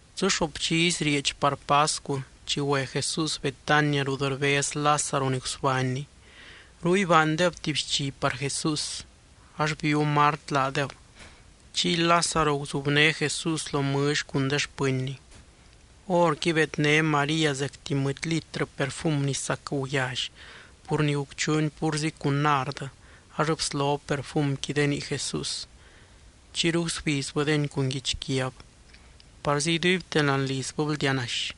Dzɨ xoop dxizy rieedx par pascu chi güe Jesús Betania rut rbez Lázaro ni gusbánny. Ruy baandeb tuby xchi par Jesús. Ax bíu Mart laadeb, chiy Lázaro guzubné Jesús lo mɨlly cun de xpɨnny. Horqui bedné María zecti mɨdy litrɨ perfum ni sac guyally pur ni gucchuuni púrzi cun nard ax bslob perfumqui de nii Jesús. Chiyru gusbizbɨdeni cun guichquiab. Parzi iduibte láani lizbɨ bldianaxy.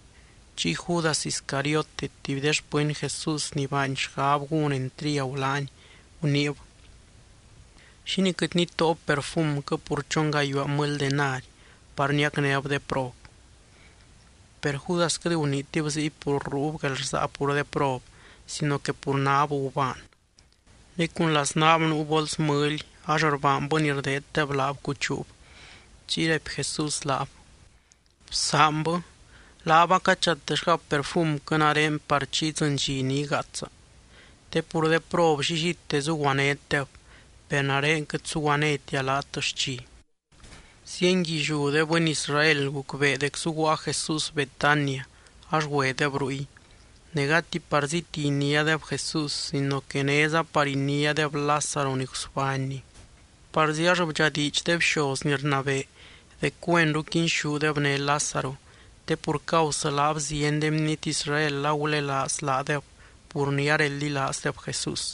Chiy Judas Iscariote, tuby de xpɨny Jesús ni baany xgab gún entriagu laany, guniib: —¿Xínii quɨt nitóob perfumquɨ pur chon gayuaa mɨly denari par niacnéb de prob? Per Judas quɨt guniitib ziy pur ruub guelrsaa pur de prob sino que pur náb gubaan. Ne cun laznaab nuu bols mɨly ax rbaanbɨ ni rdeeddeb laab cuchuub. Chiy raipy Jesús laab: —Bsaanbɨ. Laab acachatexgab perfumquɨ nare par chi idzɨny dxi ni igaatsa. Te pur de prob llillite zuguanétdeb, per nare quɨt suguanétia laat xchi. Zienguilliú de bɨny Israel gucbee dec zuguaa Jesús Betania ax güedeb ruy, ne gati parzíti iniádeb Jesús sino que néza par iniádeb Lázaro ni gusbánny. Parzi ax bdxadiidx de bxoz ni rnabee dec güenru quinxúdeb né Lázaro, te pur causɨ laab zieny de bniety Israel agulelaaz laadeb pur ni areldilaazdeb Jesús.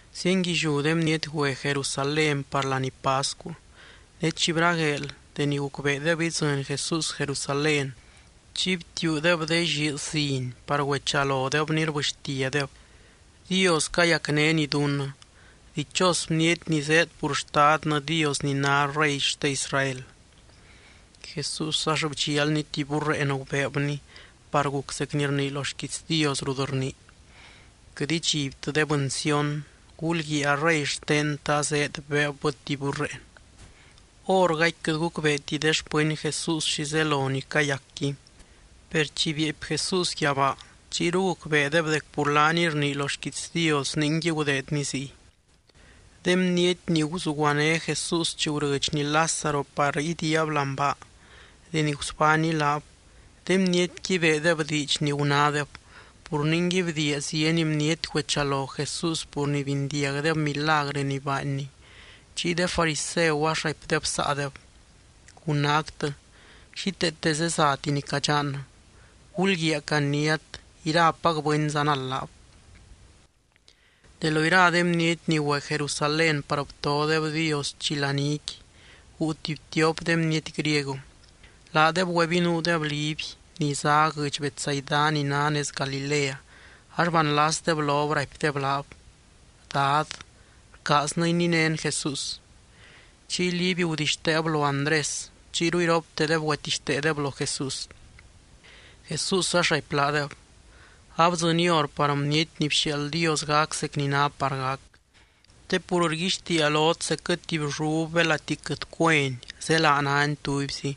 Zienguilliú de bniety güe Jerusalén par laní pascu. Ne chi bragueel deni gucbeedeb idzɨny Jesús Jerusalén, chiy btiuudeb de lliiz ziny par güechalodebny, rbɨxtiadeb: —¡Dios cayacnény dunnɨ! ¡Dichos bniety ni zéed pur Xtadnɨ Dios ni ná Rey xte Israel! Jesús ax bdxialny tuby burreen gubeebny, par guc zec ni rnii lo xquiits Dios rut rnii: Quɨt idxibtɨ de bɨny Sión. Gulguiaa a Rey xtennɨ azéed, beebbɨ tuby burreen. Hórgaqui quɨt gucbeeti de xpɨny Jesús xi zelo ni cayacqui. Per chi bieepy Jesús yabaa, chiyru gucbeedeb dec pur laaniy rnii lo xquiits Dios ningui gudeedny ziy. De bniety ni guzuguané Jesús chi gurɨdxny Lázaro par idiiab láani baa, deni gusbánny laab, de bnietqui beedeb diidx ni gunádeb. Pur ningui bdiia zieny bniety güechalo Jesús pur ni bindiagdeb milagrɨ ni baanny. Chiy de fariseu ax raipdeb saadeb: —Gunáctɨ, xíteete zezati ni cadxannɨ. Gulguiaa caniát, irapac bɨny zanald laab. De lo ira de bniety ni güe Jerusalén par btodeb Dios chi laníqui, guu tuby tiop de bniety griego. Laadeb güebinuudeb Liby, ni zá guɨdx Betsaida ni ná nez Galilea, ax banlasdeb lob raipdeb laab: —Dad, rcaaznɨ ininén Jesús. Chiy Liby gudixteeb lo Andrés, chiyru iroptedeb güetixteedeb lo Jesús. Jesús ax raipy laadeb: —Abdzɨny hor par Bniety ni bxiaald Dios gac zec ni ná par gac. Te pur rguixtiia lot, zecquɨ tuby llub belati quɨt cueni zélaa náni tubyzi,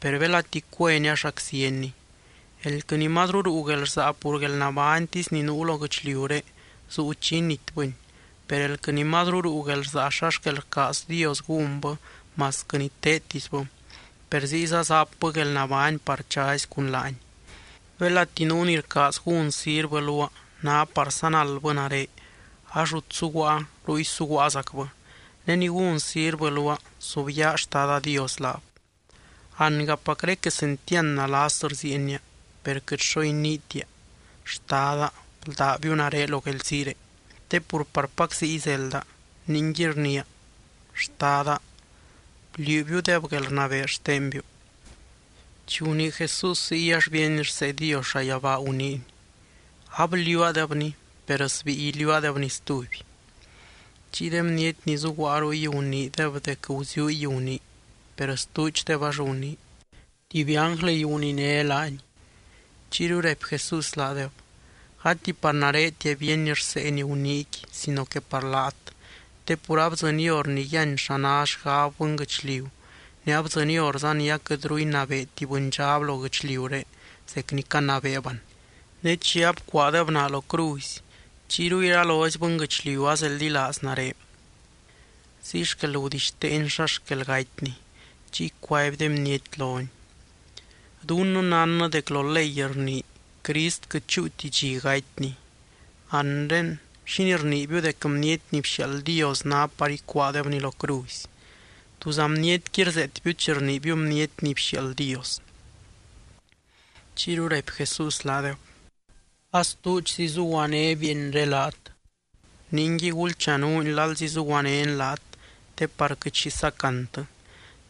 per belati cueni ax raczienni. Elquɨ ni mazru ruu guelrsaa pur guelnabánytisy ni nuu lo guɨchliuré, zuu chi initbɨni. Per elquɨ ni mazru ruu guelrsaa xa xquel rcaaz Dios gúnbɨ masquɨ ni teedtisbɨ, per ziyza zapbɨ guelnabány par chazy cun laany. Belati nuu ni rcaaz gún sirvɨ luaa, ná par zanaldbɨ nare ax rut suguaa, ruy suguaazacbɨ. Ne ni gún sirvɨ luaa, subyaa Xtada Dios laab. ’Angapacré quesentiand nalas rziienia. Per quɨt xo iniitia: “Xtada, bldábiu nare lo guelziiré”, te pur parpac ziy zelda. Ningui rniia: Xtada, bliuubiudeb guelrnabee xtenbiu. Chi gunii Jesús ziy ax bíeny rsee Dios llayabaa, guniiny: —Abliuuadebni, per sbíi iliuuadebni stuby. Chiy de bniety ni zuguaa ruy guniideb dec guziuuy gunii. Per stuudxdeb ax gunii: —Tuby ánglɨy guniné laany. Chiyru raipy Jesús laadeb: —Gati par naretia bíeny rsee ni guniiqui sino que par laat. Te pur abdzɨny hor ni yíany xa ná xgab bɨnguɨchliu ne abdzɨny horza ni aquɨtru inabeeti bɨndxab lo guɨchliuré zec ni canabeeb an. Ne chi abcuaadeb naa lo cruzy, chiyru iralozy bɨnguɨchliu azeldilaaz nare. Ziy xquel gudixteeny xa xquel gatyny. Chiy cuaby de bniety lony: —Dunnɨ nánnɨ dec lo ley rnii, Crist quɨt chúuti dxi gatyny. Anre, ¿xínii rniibiu dec Bniety ni bxiaald Dios ná par icuaadebny lo cruzy? ¿Túza bnietqui rzeetbiu chi rniibiu Bniety ni bxiaald Dios? Chiyru raipy Jesús laadeb: —A stuudxzi zuguané bieenré laat. Ningui gulchanuuny lalzi zuguanény laat, te par quɨt xi sacantɨ.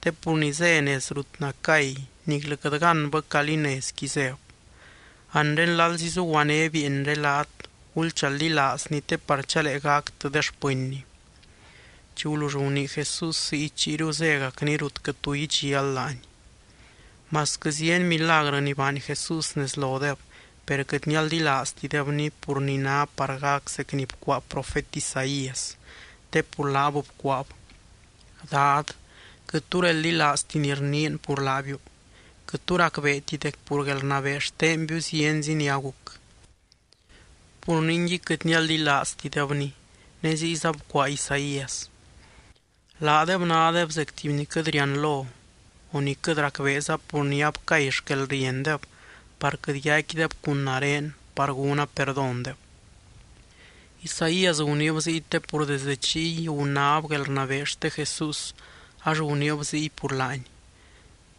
Te pur ni zé nez rut nacay niclɨ quɨt gánbɨ calí nezqui zéb. Anre lalzi zuguané bieenré laat, gulchaldilaazny te par chalee gactɨ de xpɨnny. Chi gulull gunii Jesús ziy, chiyru zégacny rut quɨt tu idxial laany. Masquɨ zieny milagrɨ ni baany Jesús nez lodeb, per quɨt nialdilaaztidebny pur ni ná par gac zec ni bcuaa profet Isaías, te pur laab bcuaab: Dad, quɨt tu reldilaazti ni rniin pur laabiu. Quɨt tu racbeeti dec pur guelrnabee xtenbiu zienzi ni aguc. Pur ningui quɨt nialdilaaztidebny. Ne ziyza bcuaa Isaías: Laadeb nádeb zec tuby ni quɨt rianlo o ni quɨt racbeeza pur ni abcay xquelriendeb par quɨt yaicquideb cun nare par gúna perdóndeb. Isaías guniib ziy te pur desdɨ chiy gunáb guelrnabee xte Jesús ax guniib ziy pur laany.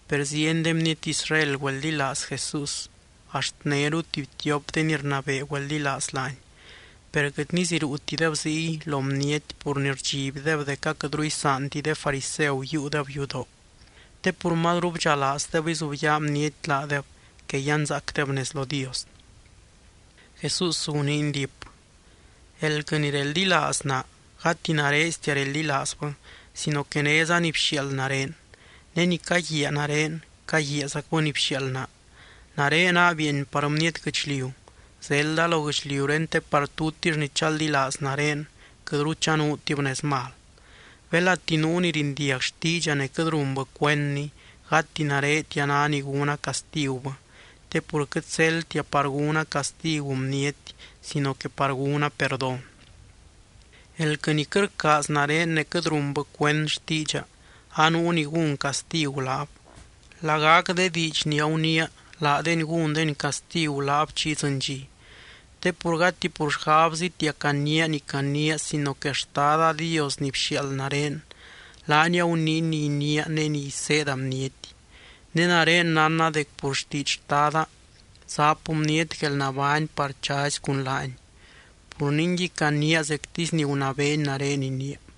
Per zieny de bniety Israel güeldilaaz Jesús, axt néru tuby tiop de ni rnabee güeldilaaz laany. Per quɨt niziruutideb ziy lo bniety pur ni rdxibdeb dec aquɨtru isaanti de fariseu yiiudeb yudoo. Te pur mazru bdxalaazdeb izubyaa bniety laadeb que yanzaacdeb nez lo Dios. Jesús guniiny diip: —Elquɨ ni reldilaaz naa, gati nareztia reldilaazbɨ sino que néza ni bxiaald nare. Ne ni caguiaa nare, caguiaazacbɨ ni bxiaald naa. Nare naa bieeny par bniety guɨchliu. Zelda lo guɨchliuré te par tutix ni chaldilaaz nare, quɨtru chanuutib nez mal. Belati nuu ni rindiag xtiidxa ne quɨt runbɨ cuendni, gati naretia ná ni gúna castigubɨ, te pur quɨt zeldtia par gúna castigu bniety sino que par gúna perdón. Elquɨ ni quɨt rcaaz nare ne quɨt runbɨ cuend xtiidxa, anuu ni gún castigu laab. Lagac de diidx ni aguniia, laadeni gúndeni castigu laab chi idzɨny dxi. Te pur gati pur xgabzitia caniia ni caniia sino que Xtada Dios ni bxiaald nare, laany aguniiny ni iniia ne ni iseeda bniety. Ne nare nánna dec pur xtiidx Xtada, zap bniety guelnabány par chazy cun laany. Pur ningui caniia zectisy ni gunabeeny nare iniia.